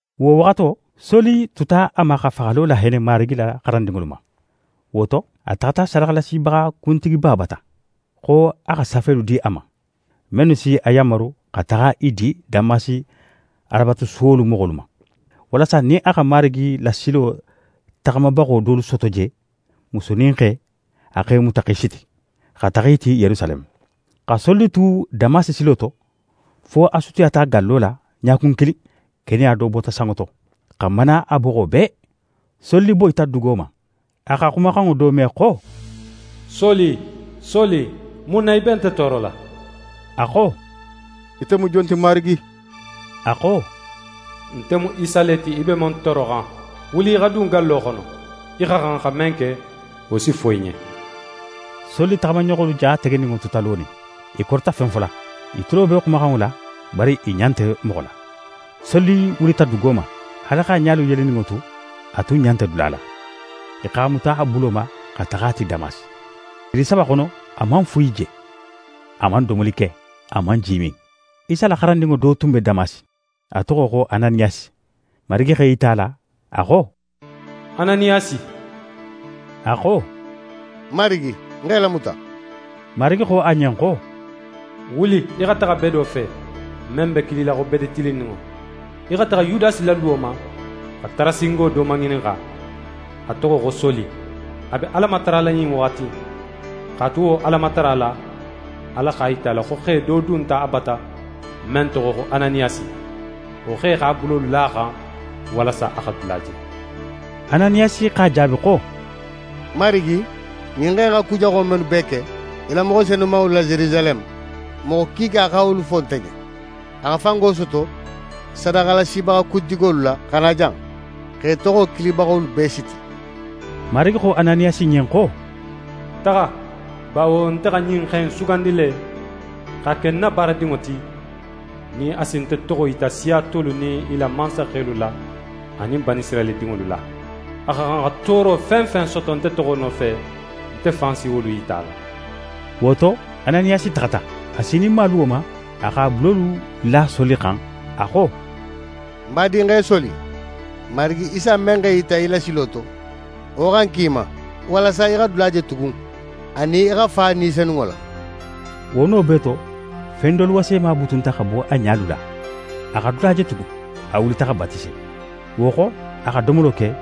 Wo waxato, Soli tuta a ma xa faxalo lahenne Marigi la xarandinŋolu ma. Wo to, a taxata sadaxalasibaxa kuntigiba bata, xo a xa safelu di a ma, mennu si a yanmaru xa taxa i di Damasi Alabatusuwolu moxolu ma; walasa nin a xa Marigi la silo taxamabaxo dolu soto je, musu nin xe, a x'e muta x'e siti, xa taxa i ti Yerusaleme. Xa Soli tu Damasi silo to, fo a sutiyata gallo la, ɲakun kilin, keneya do bota sanŋo to, xa mana a boxo bee. Soli boyita dugo ma. A xa xumaxanŋo do me xo: «Soli, Soli, mun na í be nte toorola?» A xo: «Ite mu jon ti, Marigi?» A xo: «Nte mu Isa le ti, í be men tooroxan. Wuli í xa dun gallo xono. Í xa xan xa men ke, wo si fo í ɲen.» Soli taxamaɲoxolu ja tegeninŋo tuta lonin. I korita fen fola. I tulo be xumaxanŋo la, bari i ɲa nte moxo la. Soli wulita dugo ma. Haali x'a ɲalu yeleninŋo tu, a tun ɲa nte dula la. I x'a muta a bulo ma xa taxa a ti Damasi. Tili saba xono, a man fuyi je, a man domoli ke, a man ji min. Isa la xarandinŋo do tun be Damasi, a toxo xo Ananiyasi. Marigi x'é yita a la, a xo: «Ananiyasi.» A xo: «Ń Marigi, ń x'é lamuta!» Marigi xo a ɲen xo: «Wuli í xa taxa bedo fe, men be kilila xo Bede Tilinninŋo. Í xa taxa Yudasi la luwo ma, xa Tarasingo do maŋininxa; a toxo xo Soli. A be Ala matarala ɲin waxati in. X'a tu wo Alamatara la, Ala x'a yita a la, xo xe do dunta a bata, men toxo xo Ananiyasi. Wo xe x'a bulolu la a xan, walasa a xa dula je.» Ananiyasi x'a jaabi xo: «Marigi, ɲin xe in xa ku jaxo mennu bee ke í la moxo senumanŋolu la Yerusaleme, moxo kiika xa wolu fo nte ɲen. A xa fango soto sadaxalasibaxa kuntigolu la xa na jan, x'é toxo kilibaxolu bee siti.» Marigi xo Ananiyasi ɲen xo: «Taxa, bawo nte xa ɲin xe in sugandi le, x'a ke ń na baarakedinŋo ti, nin a si nte toxo yita siya tolu nin i la mansaxelu la anin Banisirayila dinŋolu la. A xa xan xa tooro fen fen soto nte toxo nofe, nte fan si wolu yita a la.» Wo to, Ananiyasi taxata. A sininma luwo ma, a x'a bulolu la Soli xan. A xo: «Ń badinxe Soli, Marigi Isa men x'é yita í la silo to, wo xa ń ki í ma, walasa í xa dula je tugun, anin í xa fa Ni Senunŋo la.» Wo no bee to, fen dolu wasema butunta xa bo a ɲalu la. A xa dula je tugun. A wulita xa batise. Wo xo, a xa domolo ke,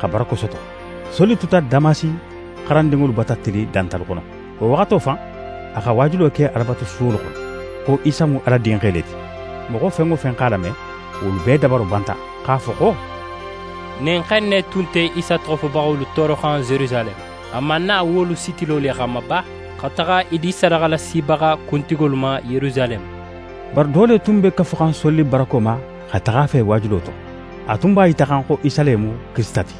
xa barako soto. Soli tuta Damasi xarandinŋolu bata tili dantalu xono. Wo waxato fan, a xa waajulo ke Alabatusuwolu xono, xo Isa mu Ala Dinxe le ti. Moxo fen wo fen x'a lame, wolu bee dabaro banta, x'a fo xo: «Ɲin xe in ne tun nte Isa toxo fobaxolu tooroxan Yerusaleme? A man na wolu sitilo le xanma ba, xa taxa i di sadaxalasibaxa kuntigolu ma Yerusaleme?» Bari do le tun be kafuxan Soli barako ma xa taxa a fe waajulo to. A tun b'a yitaxan xo Isa le mu Kirisita ti.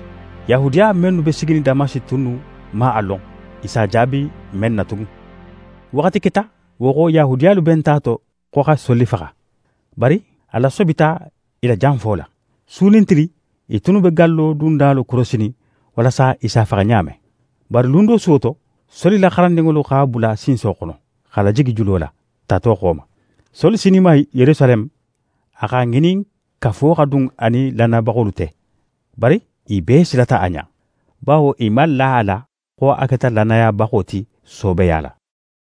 Yahudiya mennu be siginin Damasi tunnu man a lon i s'a jaabi men na tugun. Waxati keta, wo xo Yahudiyalu benta a to xo xa Soli faxa. Bari a lasobita i la janfo la. Su nin tili, i tunnu be gallo dundalu korosinin walasa i s'a faxa ɲa men. Bari lun do suwo to, Soli la xarandinŋolu x'a bula sinso xono, x'a lajigi julo la, tato xo ma. Soli sininma Yerusaleme, a x'a ŋinin kafo xa dun a nin lannayabaxolu te. Bari i bee silata a ɲa, bawo i man la a la xo a keta lannayabaxo ti soobeya la.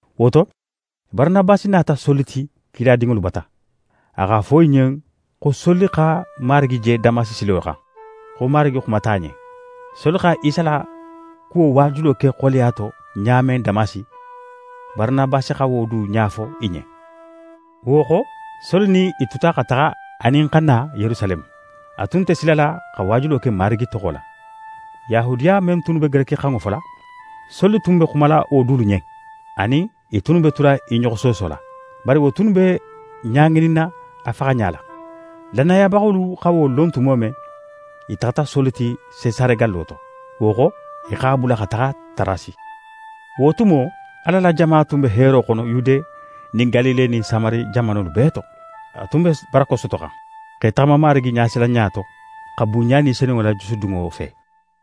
Wo to, Baranabasi nata Soli ti kiladinŋolu bata. A x'a fo i ɲen xo Soli xa Marigi je Damasi silo xan, xo Marigi xumata a ɲen. Soli xa Isa la kuwo waajulo ke xoleya to ɲa men Damasi, Baranabasi xa wo du ɲa fo i ɲen. Wo xo, Soli nin i tuta xa taxa anin xa na Yerusaleme. A tun nte silala xa waajulo ke Marigi toxo la. Yahudiya men tunnu be gerekixanŋo fola, Soli tun be xumala wo dulu ɲen; a nin i tunnu be tula i ɲoxo soosola. Bari wo tunnu be ɲa ŋininna a faxaɲa la. Lannayabaxolu xa wo lon tumo men, i taxata Soli ti Sesare gallo to. Wo xo, i x'a bula xa taxa Tarasi. Wo tumo, Ala la jama tun be heero xono Yude nin Galile nin Samari jamanolu bee to. A tun be barako sotoxan, x'é taxama Marigi ɲasilanɲa to, xa bunɲa Ni Senunŋo la jusudunno fe.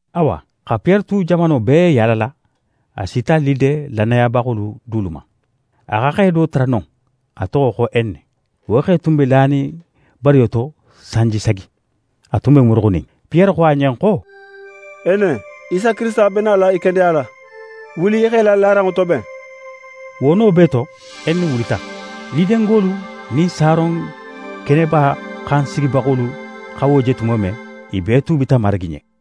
Awa xa Piyere tu jamano bee yaalala, a sita Lide lannayabaxolu dulu ma. A xa xe do tara non, a toxo xo Ene. Wo xe tun be lanin bariyo to sanji sagi. A tun be muruxunin. Piyere xo a ɲen xo: «Ene, Isa Kirisita be nala í kendeyala. Wuli í x'é la laranŋo toben.» Wo no bee to, Ene wulita. Lidengolu nin Saron keneba xan sigibaxolu xa wo je tumo men, i bee tuubita Marigi ɲen.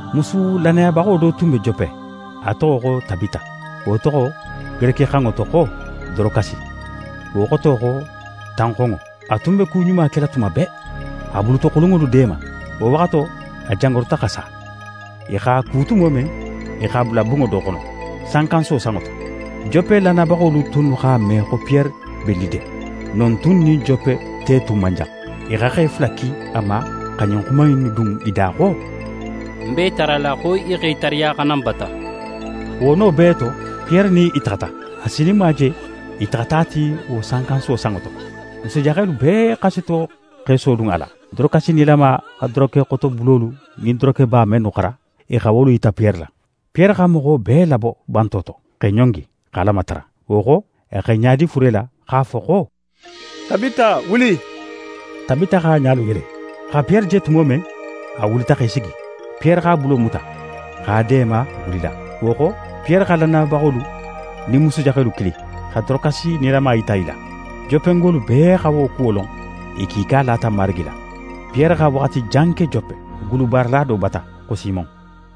Musu lannayabaxo do tun be Jope, a toxo xo Tabita. Wo toxo gerekixanŋo to xo «Dorokasi». Wo xoto xo «tanxonŋo». A tun be ku ɲuma kela tuma bee, xa bulutoxulunŋolu deema. Wo waxato, a jangaruta xa sa. I x'a ku tumo men, i x'a bula bunŋo do xono, sankansuwo sanŋo to. Jope lannayabaxolu tunnu x'a me xo Piyere be Lide. Non tun nin Jope te tun man jan. I xa xe fula ki a ma xa ɲin xuma in dun i da xo: «N b'é tarala, xo í xa í tariya xa na n bata.» Wo no bee to, Piyere nin i taxata. A sininma je, i taxata a ti wo sankansuwo sanŋo to. Musujaxelu bee xasito x'e sodun a la. Dorokasi nilama xa dorokexotobulolu nin dorokeba mennu xara, i xa wolu yita Piyere la. Piyere xa moxo bee labo banto to, x'é ɲongi, xa Ala matara. Wo xo, a x'é ɲadi fure la, x'a fo xo: «Tabita, wuli!» Tabita x'a ɲalu yele. A xa Piyere je tumo men, a wulita x'é sigi. Piyere x'a bulo muta, x'a deema wulila. Wo xo, Piyere xa lannayabaxolu nin musujaxelu kili, xa Dorokasi nilama yita i la. Jopengolu bee xa wo kuwo lon, i kiika lata Marigi la. Piyere xa waxati jan ke Jope, gulubaarala do bata, xo Simon.